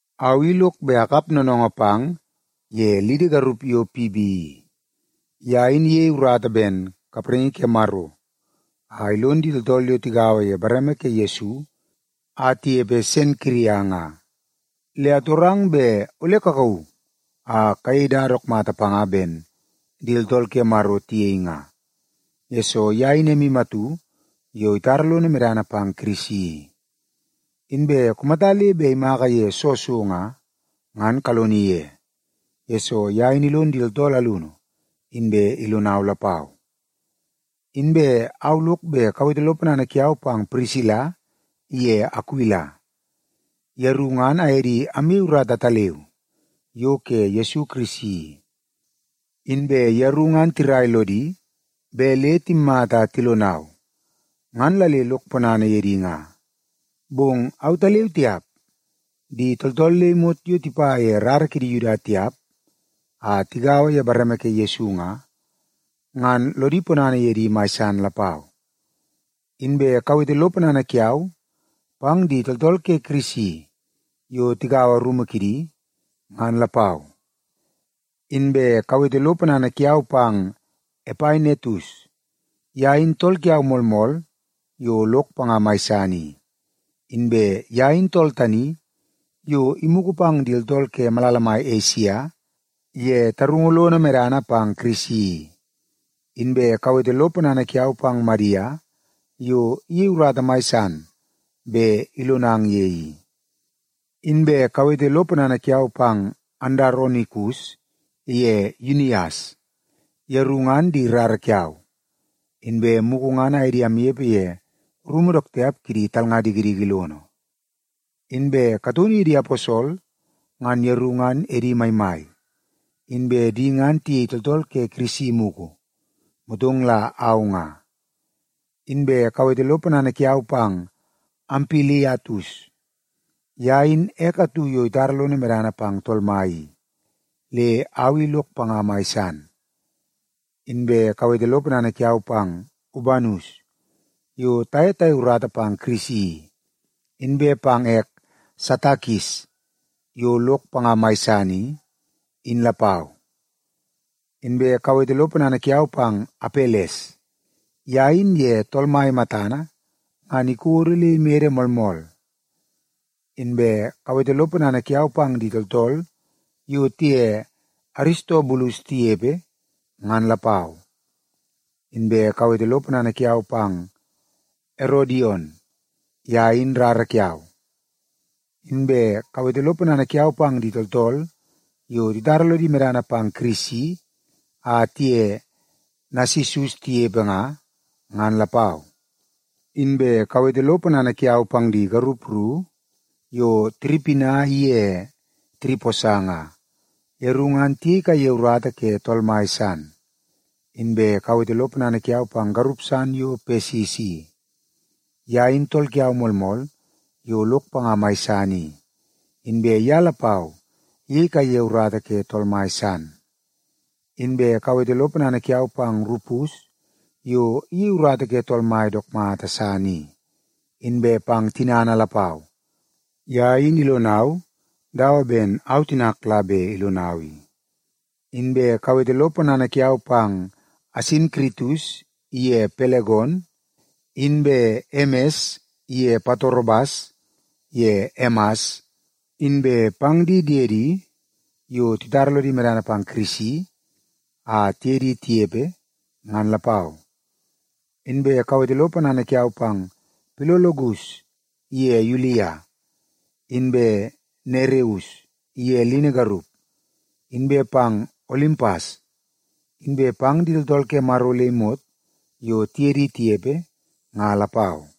Au i lok bet akap noonoongoo pang ye lidi garup yo Pibi i. Ye in iyei urata ben kapraingi ke Maro a ilon di tooltool yo tagaua ye bareme ke Yesu a tinepe Senkiria nga. Le atorang bet ole kakauu a kayei dada dook mata panga ben di tooltool ke Maro tiyei nga, yesoo ye in emu atu yo itara lono medana pang Kirisi i. Inbe kumata le bet imaka ye soo so nga, ngan kaloni ye, yesoo ye in ilon di tooltool alunu, inbe ilonau lapau. Inbe au lok bet kawete lo ponana kiau pang Pirisila iye Akuila. Yeru ngan aye di amyei urata ataleu yo ke Yesu Kirisi i. Inbe yeru ngan tirai lodi bet le timmata a tilonau, ngan la le lok ponana ye di nga. Bong autaleu tiap, di tooltool le imot yo tipa ye rara kidi Yuda tiap a tigaua ye bareme ke Yesu nga, ngan lodi ponana ye di mai san lapau. Inbe kawete lo ponana kiau pang di tooltool ke Kirisi yo tigaua rumu kidi, ngan lapau. Inbe kawete lo ponana kiau pang Epainetus. Ye in tool kiau moolmool yo lok panga mai san i. Inbe ye in tool tani yo imugu pang di tooltool ke malala mai Esia ye tarungu lono medana pang Kirisi i. Inbe kawete lo ponana kiau pang Madia yo iyei urata mai san bet ilonang ye i. Inbe kawete lo ponana kiau pang Andaronikus iye Yunias. Yeru ngan di rara kiau, inbe mugu ngan aye di amnepe ye rumu dook tiap kidi talnga dikidiki lono. Inbe kataunu ye di aposol ngan yeru ngan edi maimai, inbe di ngan tiyei tooltool ke Kirisi mugu, motong la au nga. Inbe kawete lo ponana kiau pang Ampiliatus. Ye in ek atu yo itara lono medana pang Tool Mai i, le au i lok panga mai san. Inbe kawete lo ponana kiau pang Ubanus, yo taye tayei urata pang Kirisi i, inbe pang ek Satakis yo lok panga mai san i, in lapau. Inbe kawete lo ponana kiau pang Apeles, ye in ye Tool Mai matana ngan ikodo le imede moolmool. Inbe kawete lo ponana kiau pang di tooltool yo tiye Aristobulus tinepe, ngan lapau. Inbe kawete lo ponana kiau pang Erodion. Ye in rara kiau. Inbe kawete lo ponana kiau pang di tooltool yo titara lodi medana pang Kirisi a tiye Nasisus tinepe nga, ngan lapau. Inbe kawete lo ponana kiau pang di garup ru yo Tiripina iye Tiriposa nga. Yeru ngan tiyei kaiye urata ke Tool Mai san. Inbe kawete lo ponana kiau pang garup san yo Pesis i. Ye in tool kiau moolmool yo lok panga mai san i, inbe ye lapau iyei kaiye urata ke Tool Mai san. Inbe kawete lo ponana kiau pang Rupus yo iyei urata ke Tool Mai dook mata san i, inbe pang tinana lapau. Ye in ilonau dawa ben au tinak la bet ilonau i. Inbe kawete lo ponana kiau pang Asinkiritus iye Pelegon, inbe Emes iye Patrobas ye Emas, inbe pang di diedi yo titara lodi medana pang Kirisi a tiye di tinepe, ngan lapau. Inbe kawete lo ponana kiau pang Pilologus iye Yulia, inbe Nereus iye lini garup, inbe pang Olimpas, inbe pang di tooltool ke Maro le imot yo tiye di tinepe nga lapau.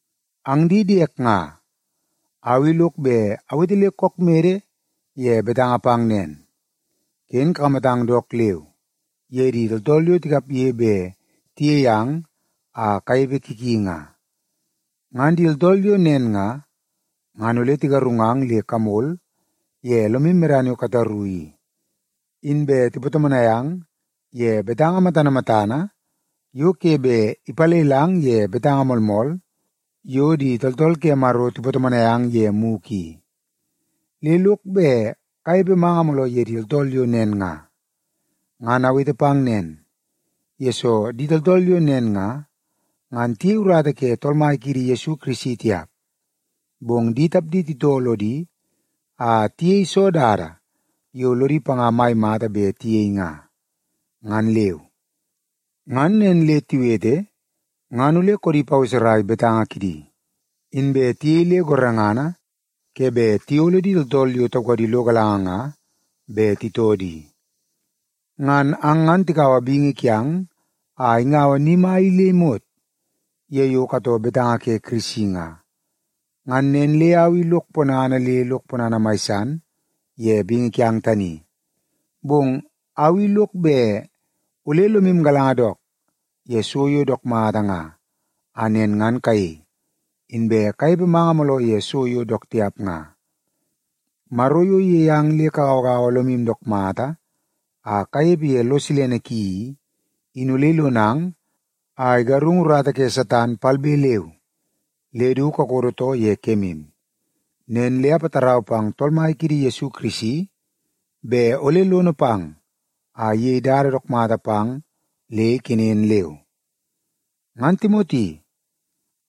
Ang di diek nga, au i lok bet awete le kook mede ye betanga pang nen, ken kakamatang dook leu ye di tooltool yo tikapge bet tiyei ang a kanepe ki ki nga. Ngan di tooltool yo nen nga, ngan ole tigarungang le kamol ye lomu medana yo kataru i, inbe tipatomonai ang ye betanga matana matana yo ke bet ipalelang ye betanga moolmool yo di tooltool ke Maro tipatomonai ang ye mugu i. Le lok bet kanepe manga mooloo ye di tooltool yo nen nga. Ngan awete pang nen, yesoo di tooltool yo nen nga, ngan tiyei urata ke Tool Mai kiidi Yesu Kirisi tiap, bong di tapdi titoo lodi a tiyei soo dada yo lodi panga mai mata bet tiyei nga, ngan leu. Ngan nen le tiwete ngan ole koodi paweserai betanga kidi, inbe tiyei le gorengana ke bet tiyolo di tooltool yo taukadi lo galanga nga bet titoo di. Ngan ang ngan tikaua bingi kiang a ingaua ni mai i le imot ye yo katoo betanga ke Kirisi nga. Ngan nen le au i lok ponana le lok ponana mai san ye bingi kiang tani. Bong au i lok bet ole lomu galanga dook ye so yo dook mata nga a nen ngan kayei, inbe kanepe manga mooloo ye so yo dook tiap nga. Maro yo iyei ang le kagauagaua lomu dook mata a kanepe ye lo silene ki i, in ole ilonang a igarungu urata ke Satan palbe leu le du kakodo too ye kemu. Nen le apatarau pang Tool Mai kiidi Yesu Kirisi bet ole lono pang a iyei dada dook mata pang le ikenen leu. Ngan Timoti,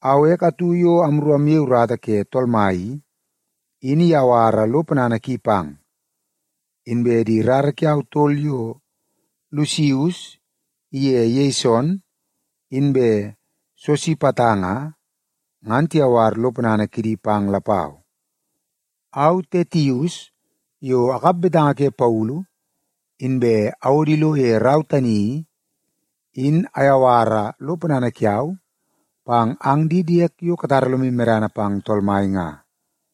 au ek atu yo amru amyei urata ke Tool Mai i, in iyawara lo ponana ki pang. Inbe di rara kiau tol yo Lusius iye Yeson inbe Sosipata nga, ngan tiyawar lo ponana kidi pang lapau. Au Tetius, yo akap betanga ke Paulu inbe awodo ilo ye rau tani i, in ayawara lo ponana kiau pang ang di diek yo katara lomu medana pang Tool Mai nga.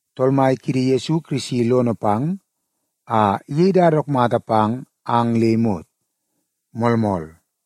Tool Mai kiidi Yesu Kirisi lono pang a iyei dada dook mata pang ang le imot. Moolmool.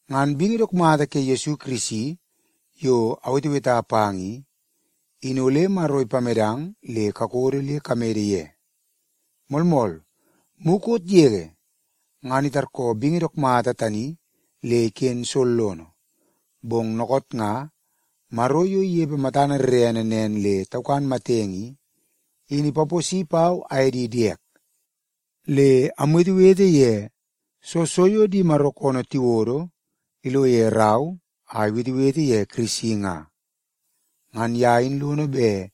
Ngan bingi dook mata ke Yesu Kirisi yo aweteweta pang i, in ole Maro ipamedang le kakodo le kamede ye. Moolmool, mukot yege ngan itarkoo bingi dook mata tani le iken sollono, bong dookoot nga, Maro yo inepe matana rerene nen le taukan matenge i, in ipaposi pau aye di diek, le amwetewete ye soo so di Maro koonoo tiwodo ilo ye rau a iwetewete ye Kirisi nga. Ngan ye in lono bet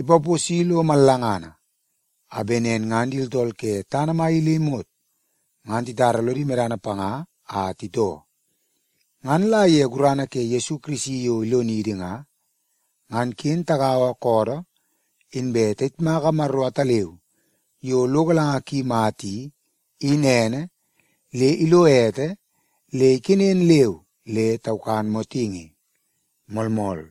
ipaposi lo mallangana, a bet nen ngan di tooltool ke tana mai i le imot ngan titara lodi medana panga a titoo. Ngan la ye gurana ke Yesu Kirisi yo ilonidi nga, ngan ken tagaua koodoo inbe tayitmaka Maro ataleu yo lo galanga ki mata i, in ene, le ilo ete le ikenen leu le taukan motingi. Moolmool.